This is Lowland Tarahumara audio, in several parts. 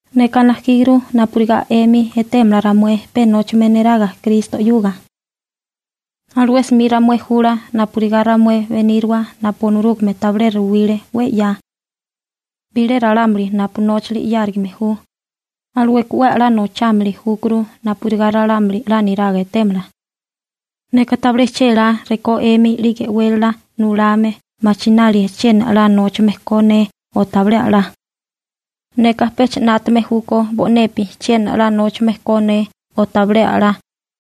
Neka najkíguru napurigá 'emi etémala ramué pe nóchame neraga Kristo 'yuga. Alué 'smi ramué jula napurigá ramué beníriwa napu Onorúgame tabilé ruwile 'we 'ya. Bilé ralámuli napu nóchali 'yárigame ju, alueka 'we 'la nochámili júkuru napurigá ralámuli 'la niraga etémala. Neka tabilé chélá rekó 'emi 'lige e'wélala nulame machinálie chiena 'la nóchame ko ne o tabilé a'lá. Neka pecha 'nátame júkó bo'nepi chiena 'la nóchame ko ne o tabilé a'lá.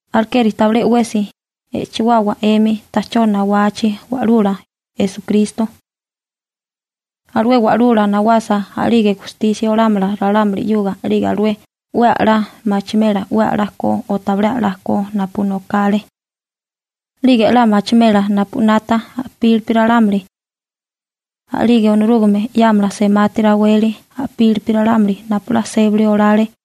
Alekeri, tabilé 'wesi e'chewawa 'emi ta'chó nawachi Wa'lula Esukristo. Alué Wa'lula nawasa, a'lige gustisia olámala ralámuli 'yuga, 'lige alué 'we a'lá machimela 'we a'lá ko o tabilé la ko napu nokale. 'Lige 'la machimela napu 'nata a'pílipi ralámuli. A'lige Onorúgame 'yámala semati raweli a'pili ralámuli napu 'la sébali olale.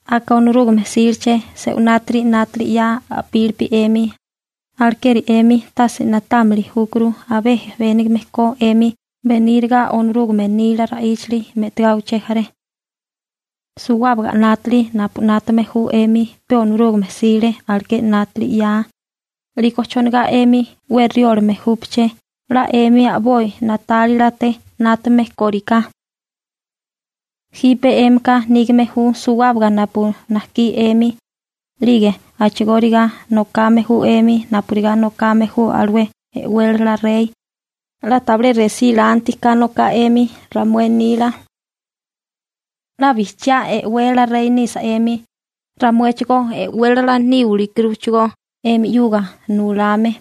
Aka Onorúgame 'síleché se'unátiri 'nátali 'ya a'pílipi 'emi, alekeri 'emi tase na'támili júkuru abé jebénigame ko 'emi beníraga Onorúgame nila ra'íchali me'tigá uché jaré. Suwábaga 'nátali napu 'nátame ju 'emi pe Onorúgame 'sile aleké 'nátali 'yaa, 'liko chonigá 'emi 'we riólame júpaché 'la 'emi a'boi na'tálilate 'nátame kóriká. Jipe 'émika nígame ju suwábaga napu najkí 'emi, 'lige a'chigóriga nokame ju 'emi napurigá nokame ju alué e'wélala rey, 'la tabilé resí lanti ka noká 'emi ramué nila. ¡'La bijchiá e'wélala rey nisa 'emi, ramuéchigó e'wélala níwili júkuruchigó 'emi 'yuga nulame!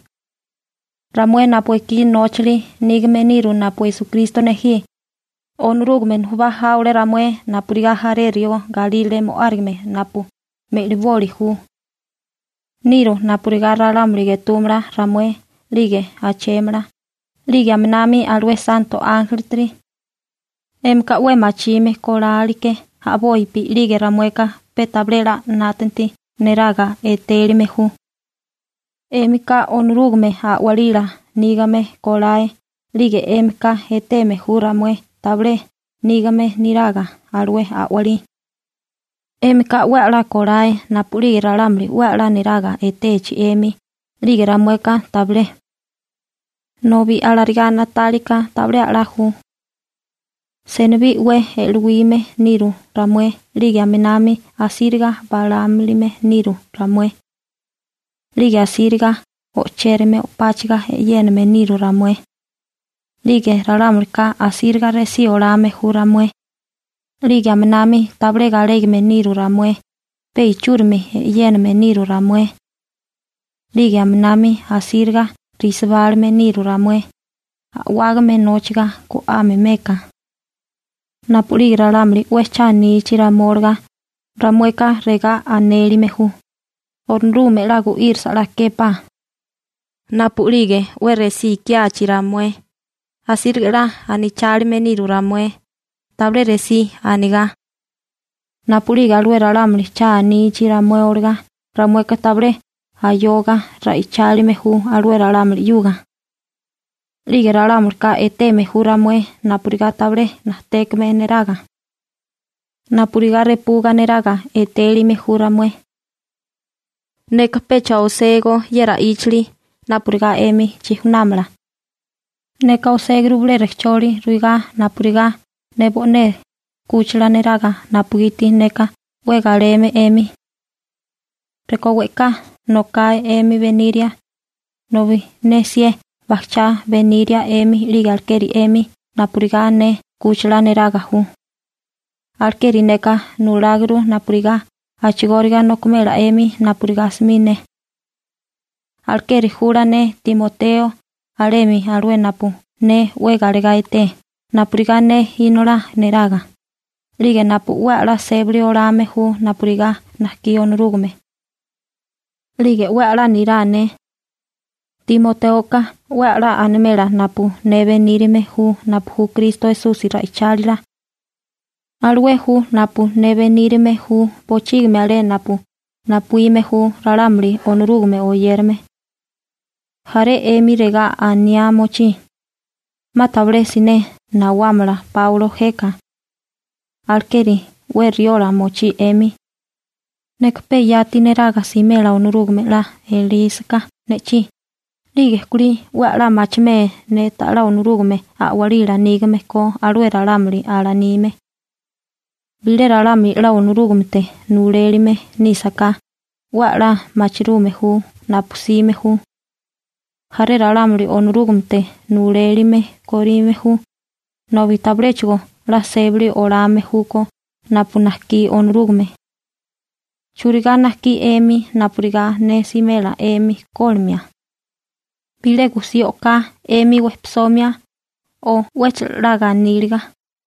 Ramué napu ekí nóchali nígame niru napu Esukristo nejí, Onorúgame nujubá jáwale ramué napurigá jaré rió galírale mo'árigame napu meliboli ju. Niru napurigá ralámuli getúmala ramué 'lige ajchémala, 'lige aminami alué santo ánjelitiri. 'Émika 'we machime koláleké a'bopi 'lige ramueka pe tabilé 'la 'nátanti neraga etélime ju. 'Émika Onorúgame a'walila nígame kolae 'lige 'émika eteme ju ramué tabilé nígame niraga alué a'walí. 'Émika 'we 'la kolae napu'lige ralámuli 'we 'la niraga etechi 'emi 'lige ramueka tabilé. Nobi alarigá na'tálika tabilé 'la ju. Senibí 'we e'luíme niru ramué 'lige aminami asíriga balámilime niru ramué. 'Lige asíriga o'chérame o'páchaga e'yéname niru ramué. 'Lige ralámulika asíriga resí olame ju ramué. 'Lige aminami tabilé galégame niru ramué, pe ichúrimi e'yéname niru ramué. 'Lige aminami asíriga resibálime niru ramué a'wágame nóchiga go'ame meka. Napu'lige ralámuli 'we cha anichi ramué olagá, ramueka regá anélime ju: «Onorúgame 'la gu'írasa 'la képá.» Napu'lige 'we resí ikiachi ramué, asíriga 'la anachálime niru ramué, tabilé resí anigá. Napu'lige alué ralámuli cha anichi ramué olagá, ramueka tabilé ayoga ra'ichálime ju alué ralámuli 'yuga. 'Lige ralámulika eteme ju ramué napurigá tabilé najtékame neraga. Napurigá repuga neraga etélime ju ramué. Neka pecha oségó ye ra'íchali napurigá 'emi chijunámala. Neka oséguru bilé rejcholi ruigá napurigá ne bo'né 'kúchila neraga napugiti neka 'we galeme 'emi. Rekó we'ká nokae 'emi beniria, nobi ne 'sié bajchá beníria 'emi, 'lige alekeri 'emi napurigá ne 'kúchila neraga ju. Alekeri neka nuláguru napurigá a'chigóriga nokimela 'emi napurigá 'smi ne. Alekeri jula ne Timoteo alemi, alué napu ne 'we galegá eté napurigá ne inolá neraga, 'lige napu 'we a'lá sébili olame ju napurigá najkí Onorúgame. 'Lige 'we a'lá nirá ne. Timotéoka 'we a'lá animela napu ne benírame ju napu ju Kristo Esusi ra'ichálila. Alué ju napu ne benírime ju bochígimi alé napu napuíme ju ralámuli Onorúgame oyérame. Jaré 'emi regá aniá mochí: «'Ma tabilé siné nawámala Páulo jeka.» Alekeri 'we riola mochí 'emi. Neka pe yati neraga simela Onorúgame 'la elísaká ne'chí, 'lige kulí 'we a'lá machimé ne ta'lá Onorúgame a'walila nígame ko alué ralámuli alanime. Bilé ralámuli 'la Onorúgamete nulelime nísaká, 'we 'la machirume ju napu 'sime ju. Jaré ralámuli Onorúgamete nulelime korime ju, nobi tabiléchigo 'la sébali olame júkó napu najkí Onorúgame. ¿Churigá najkí 'emi napurigá ne simela 'emi kólimia? ¿Bilé gusí o'ká 'emi wejpisomia, o 'wéchala 'la ganíliga?